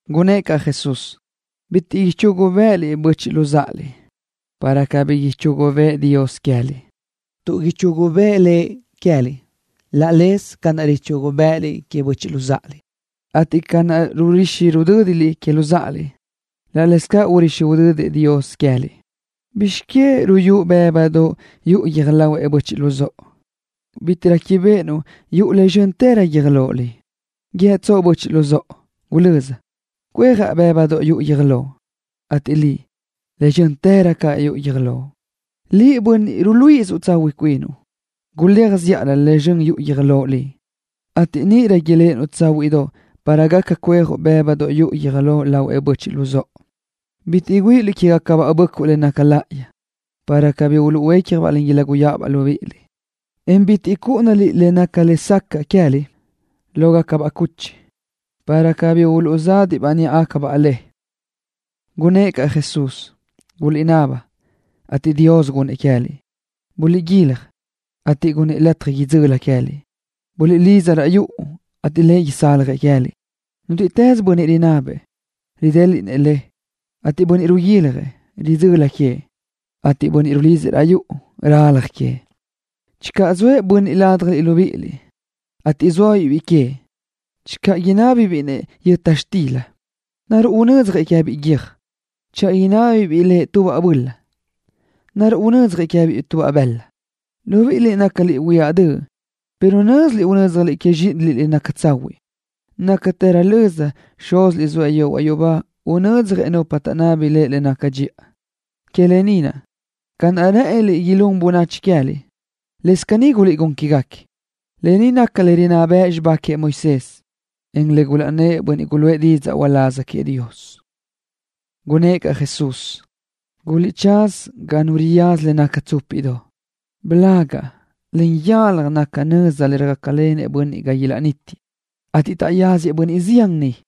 Gunnë́ʼ caʼ Jesús: —Bitiʼ ichugu bë́ʼëliʼ böchiʼ luzáʼaliʼ, para cabí ichugu bëʼë Dios queë́liʼ, tuʼ ichugu bëʼë Lëʼ queë́liʼ laʼ leze ca naʼ richugu bë́ʼëliʼ queëʼ böchiʼ luzáʼaliʼ, ateʼ ca naʼ rurixi rudö́diliʼ que luzáʼaliʼ, laʼ cáʼasö urixi udödëʼ Dios queë́liʼ. ¿Bizx que ruyúʼ bë́budoʼ yuʼu guiö́j lahuëʼ böchiʼ luzóʼo, en bitiʼ réquibeʼenuʼ yuʼu le zxö́ntërö guiö́j loʼ liʼ? ¿Guíëtsoʼ böchiʼ luzóʼo: “Gulö́z, cuejaʼ bë́budoʼ yuʼu guiö́j loʼ”, ateʼ liʼ, le zxö́ntërö caʼ yuʼu guiö́j loʼ liʼ? Liʼ, bönniʼ ruluíʼisö tsahuiʼ cuinuʼ. Guléaj zíʼalö le zxön yuʼu guiö́j loʼ liʼ, ateʼ níʼirö iléʼenuʼ tsáhuiʼdoʼ para gaca cuejuʼ bë́budoʼ yuʼu guiö́j lahuëʼ böchiʼ luzóʼo. ’Bitiʼ güíʼiliʼ quégacabaʼ böʼcuʼ le naca láʼayi, para cabí uluʼhuécjabaʼ, en iláguyaʼabaʼ libíʼiliʼ, en bitiʼ chúʼunaliʼ le naca lesacaʼ queë́liʼ láhuigacabaʼ cuchi, para cabí uluʼzadiʼ níʼabaʼ le. Gunnë́ʼ caʼ Jesús: —Guliʼnaba, ateʼ Dios gunnëʼ queë́liʼ. Guliʼguilaj, ateʼ gunnëʼ lataj idzöli queë́liʼ. Buliʼlidza raʼ yuʼu, ateʼ Lëʼ isaljëʼ queë́liʼ. Nútiʼtës bönniʼ rinabëʼ, ridéliʼnëʼ, ateʼ bönniʼ riguiljëʼ, ridzöli queëʼ, ateʼ bönniʼ rulidzëʼ raʼ yuʼu, ralaj queëʼ. ’Channö zoëʼ nu bönniʼ ládjaliʼ libíʼiliʼ, ateʼ zóabiʼ biʼi queëʼ, channö inábibiʼ lëʼ yöta xtila, ¿naruʼ unödzjëʼ-biʼ guiö́j? Channö inábibiʼ lëʼ tubaʼ böla, ¿naruʼ unödzjëʼ-biʼ bëla? Libíʼiliʼ nácaliʼ huiáʼ döʼ, pero nö́ziliʼ unö́dzjaliʼ zxíʼiniliʼ le naca tsahuiʼ. Nácatërö löza, Xúziliʼ zoëʼ yehuaʼ yubá unödzjëʼ nupa taʼnábini Lëʼ le naca dxiʼa. ’Que lë ni naʼ, ca naʼ rë́ʼëniliʼ ilún bönachi queë́liʼ, lëscaʼ caní guliʼgún quégaquiëʼ. Lë ni naca le rinná bëʼ xibá queëʼ Moisés, encaʼ le gulaʼnnë́ʼ bönniʼ guluʼë didzaʼ uláz queëʼ Dios. Gunnë́ʼ caʼ Jesús: —Guliʼtsáz ga nu riyaza le naca tsúpiʼdoʼ. Blagaʼ naca ga nu riyaza, en yalaj naca nöza le röjácalenëʼ bönniʼ ga niʼ ilaʼnítiëʼ, ateʼ taʼyáziëʼ bönniʼ zián niʼ.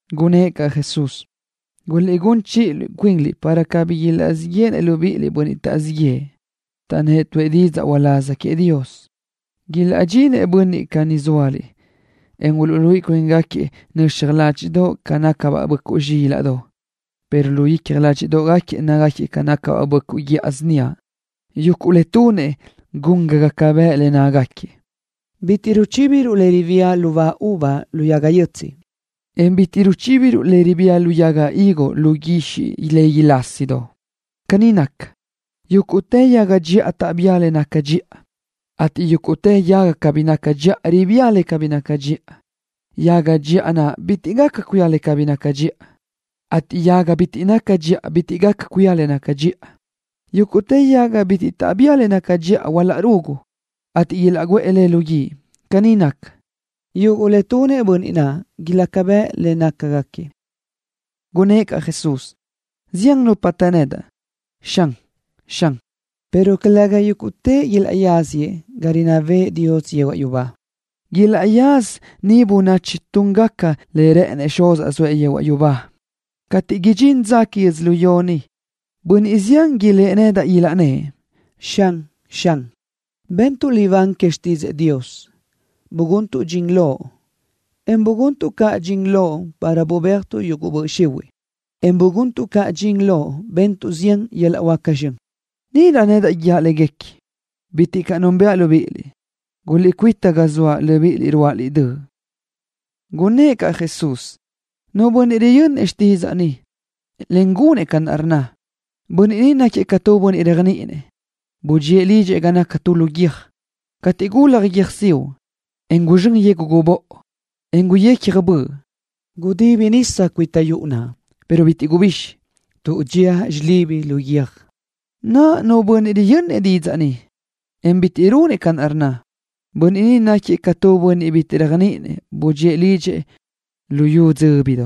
Gunnë́ʼ caʼ Jesús: —Guliʼgún chiʼi cuinliʼ para cabí ilaʼzíʼ yéʼenëʼ bönniʼ taʼzíʼ yëʼë libíʼiliʼ, taʼnnë́ʼ tuʼë didzaʼ uláz queëʼ Dios. Ilaʼdxinëʼ bönniʼ caní ga zóaliʼ, en uluʼluíʼi cuíngaquiëʼ nöxaj ládxiʼdoʼ ca nácagacabaʼ böʼcuʼ zxílaʼdoʼ, pero lu icja ládxiʼdoʼgaquiëʼ nácagaquiëʼ ca böʼcuʼ guíʼa síniaʼ. Yuguʼ le tunëʼ ilaca bëʼ le nácagaquiëʼ. Bitiʼ ruchíbiruʼ le ribía lubá uva lu yaga yötsiʼ, en bitiʼ ruchíbiruʼ le ribía yaga higo lu guixiʼ legui lásidoʼ. Caní naca, yúguʼtë yaga dxiʼa taʼbía le naca dxiʼa, ateʼ tu yaga cabí naca dxiʼa ribía le cabí naca dxiʼa. Yaga dxiʼa naʼ bitiʼ gaca cuía le cabí naca dxiʼa, ateʼ yaga naʼ bitiʼ naca dxiʼa bitiʼ gaca cuía le naca dxiʼa. Yúguʼtë yaga bitiʼ taʼbía le naca dxiʼa ilaʼrugu, ateʼ ilaʼguʼë léguequi lu guíʼ. Caní naca, yuguʼ le tunëʼ bönniʼ naʼ ilaca bëʼ le nácagaquiëʼ. Gunnë́ʼ caʼ Jesús: —Zian nupa të nedaʼ: “Xan, Xan”, pero calëga yúguʼtëʼ ilaʼyáziëʼ ga rinná bëʼë Dios yehuaʼ yubá. Ilaʼyázasëʼ niʼ bönniʼ tunëʼ ca rë́ʼënëʼ Xuzaʼ Dios, zoëʼ yehuaʼ yubá. Cateʼ idxín dza údxi que yödzölió ni, bönniʼ zián ilë́ʼ nedaʼ, ilaʼnnë́ʼ: “Xan, Xan, bentuʼ libán que xtídzëʼë Dios, buguntuʼ dxin Loʼ, en buguntuʼ caʼ dxin Loʼ para bubéajtuʼ yuguʼ böʼ xihuiʼ, en buguntuʼ caʼ dxin Loʼ bentuʼ zián yöl-laʼ huáca zxön.” Níʼirö nedaʼ guíaʼ légaquiëʼ: “Bitiʼ caʼ núnbëʼa libíʼiliʼ. Guliʼcuíta ga zoaʼ, libíʼiliʼ ruáʼaliʼ döʼ.” Gunnë́ʼ caʼ Jesús: —Iaʼstú caʼ, nu bönniʼ riyönnëʼ xtídzaʼa ni, en gunëʼ ca rnna, bönniʼ ni náquiëʼ ca tu bönniʼ réajniʼinëʼ, budxíëʼ lidxëʼ ga naca lu guiö́j. Cateʼ gulaj guiö́jsiuʼ, en guzxö́n yegu gubóʼo, en guyecja böʼ, gudibi nisa cuita yuʼu naʼ, pero bitiʼ gubixi, tuʼ dxía xilibi lu guiö́j. Naʼa, nu bönniʼ riyönnëʼ xtídzaʼa ni, en bitiʼ runëʼ ca rnna, bönniʼ ni náquiëʼ ca tu bönniʼ bitiʼ réajniʼinëʼ, budxíëʼ lidxëʼ lu yu dzöbi.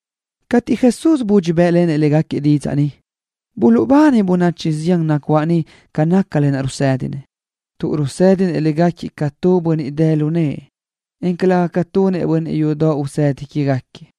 Cateʼ Jesús budxi bë́ʼlenëʼ légaquiëʼ didzaʼ ni, buluʼbani bönachi zián nacuáʼ niʼ ca naca le rusédinëʼ, tuʼ rusédinëʼ légaquiëʼ ca tu bönniʼ dë lu nëʼë, en calëga ca tunëʼ bönniʼ yudoʼ usedi quégaquiëʼ.